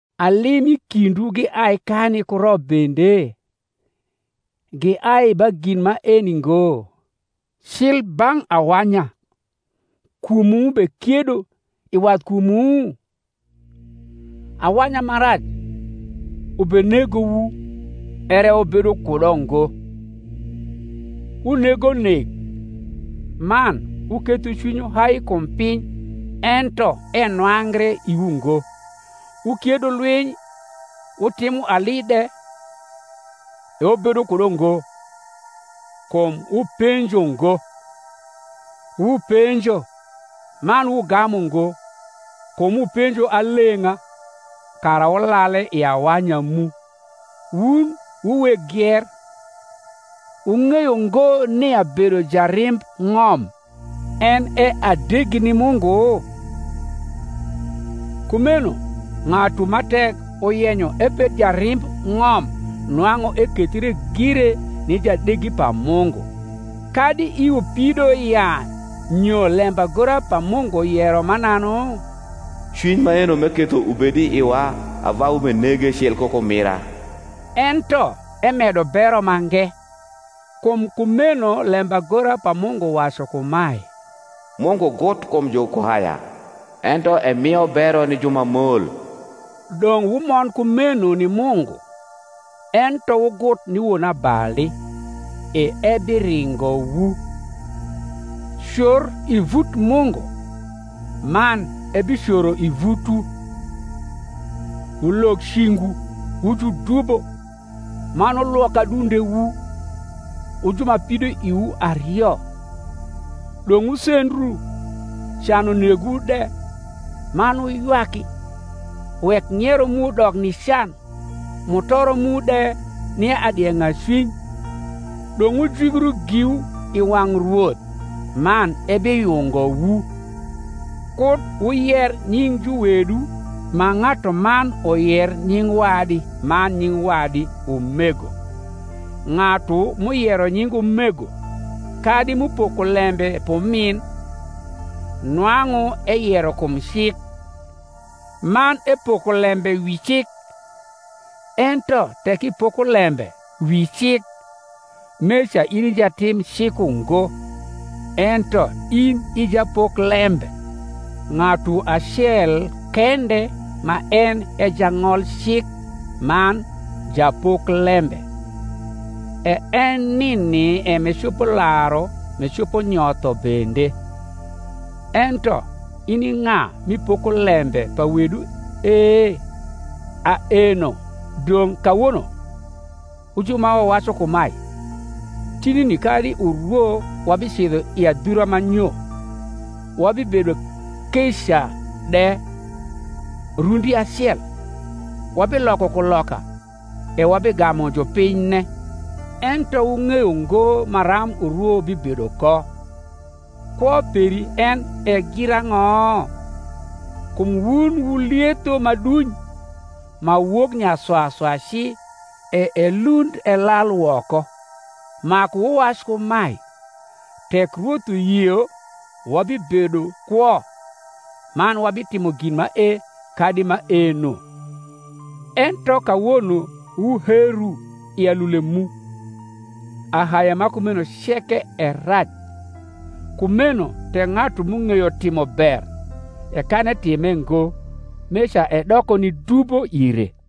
Ali m’i kindwu giai kani ku rop bende? giai ba gin maeni ngo, cli bang’ awanya kumwu m’ubekiedo i wathkumwu? Awanya ma rac ubenegowu, ere wubedo kudo ngo: wunego nek, man wuketho cwinywu hai kum piny, ento enwangre iwu ngo: wukiedo lwiny wutimo ali de; e wubedo kudo ngo, kum wupenjo ngo. Wupenjo, man wugamu ngo, kum wupenjo aleng’a, kara wulale i awanya mu. Wun wu weg gier, wung’eyo ngo nia bedo jarimb ng’om en e adegi ni Mungu? Kumeno ng’atu ma tek uyenyo ebed jarimb ng’om nwang’u ekethre gire ni jadegi pa Mungu. Kadi iwu pido ya nyo lembagora pa Mungu yero mananu? Cwiny maeno m’eketho ubed i iwa ava ubenege cil ku kumira? Ento emedo bero mange. Kum kumeno lembagora pa Mungu wacu kumae, Mungu gut kum jukuhaya, ento emio bero ni ju ma mol. Dong’ wumond kumeno ni Mungu: ento wugut ni wonabali, e ebiringowu. Cor i vut Mungu, man ebicoro i vutwu. Wulog cingwu, wu judubo; man wulwok adundewu, wu ju ma pidoiwu ario. Dong’ wusendru, can unegwu de, man wuywaki: wek ng’iero mu dok ni can, mutoro mu de ni adieng’acwiny. Dong’ wujwigru giwu i wang’ Rwoth, man ebiyungowu. Kud wuyer nying juwedu ma ng’atuman uyer nying wadi man nying wadi, umego. Ng’atu m’uyero nying umego, kadi m’upoko lembe p’umin, nwang’u eyero kum cik, man epoko lembe wi cik: ento tek ipoko lembe wi cik, meca in i jatim cik ungo, ento in i japoklembe. Ng’atu acel kende ma en e jang’olcik man japoklembe, e en nini e m’ecopo laru m’ecopo nyotho bende: ento in i ng’a m’ipoko lembe pa wedu e? Aeno dong’ kawono, wu jn ma wnwacu kumae, Tinuni kadi urwo wabicidho i adhura ma nyo, wabibedo keea de rnndacel, wabiloko kuloka, e wabigamu jupinyne: ento wung’eyo ngo maram urwo bibedo ko. Kwo peri en e girang’o? kum wun wu lietho ma duny, ma wok nyaswaswa ci, e elund elal woko. Maku wuwac kumae, Tek Rwoth uyio wabibedo kwo, man wabitimo gin mae kadi maeno. Ento kawono wuheru i alule mu: ahaye ma kumeno ceke e rac. Kumeno tek ng’atu m’ung’eyo timo ber, e kan etime ngo, meca edoko ni dubo ire.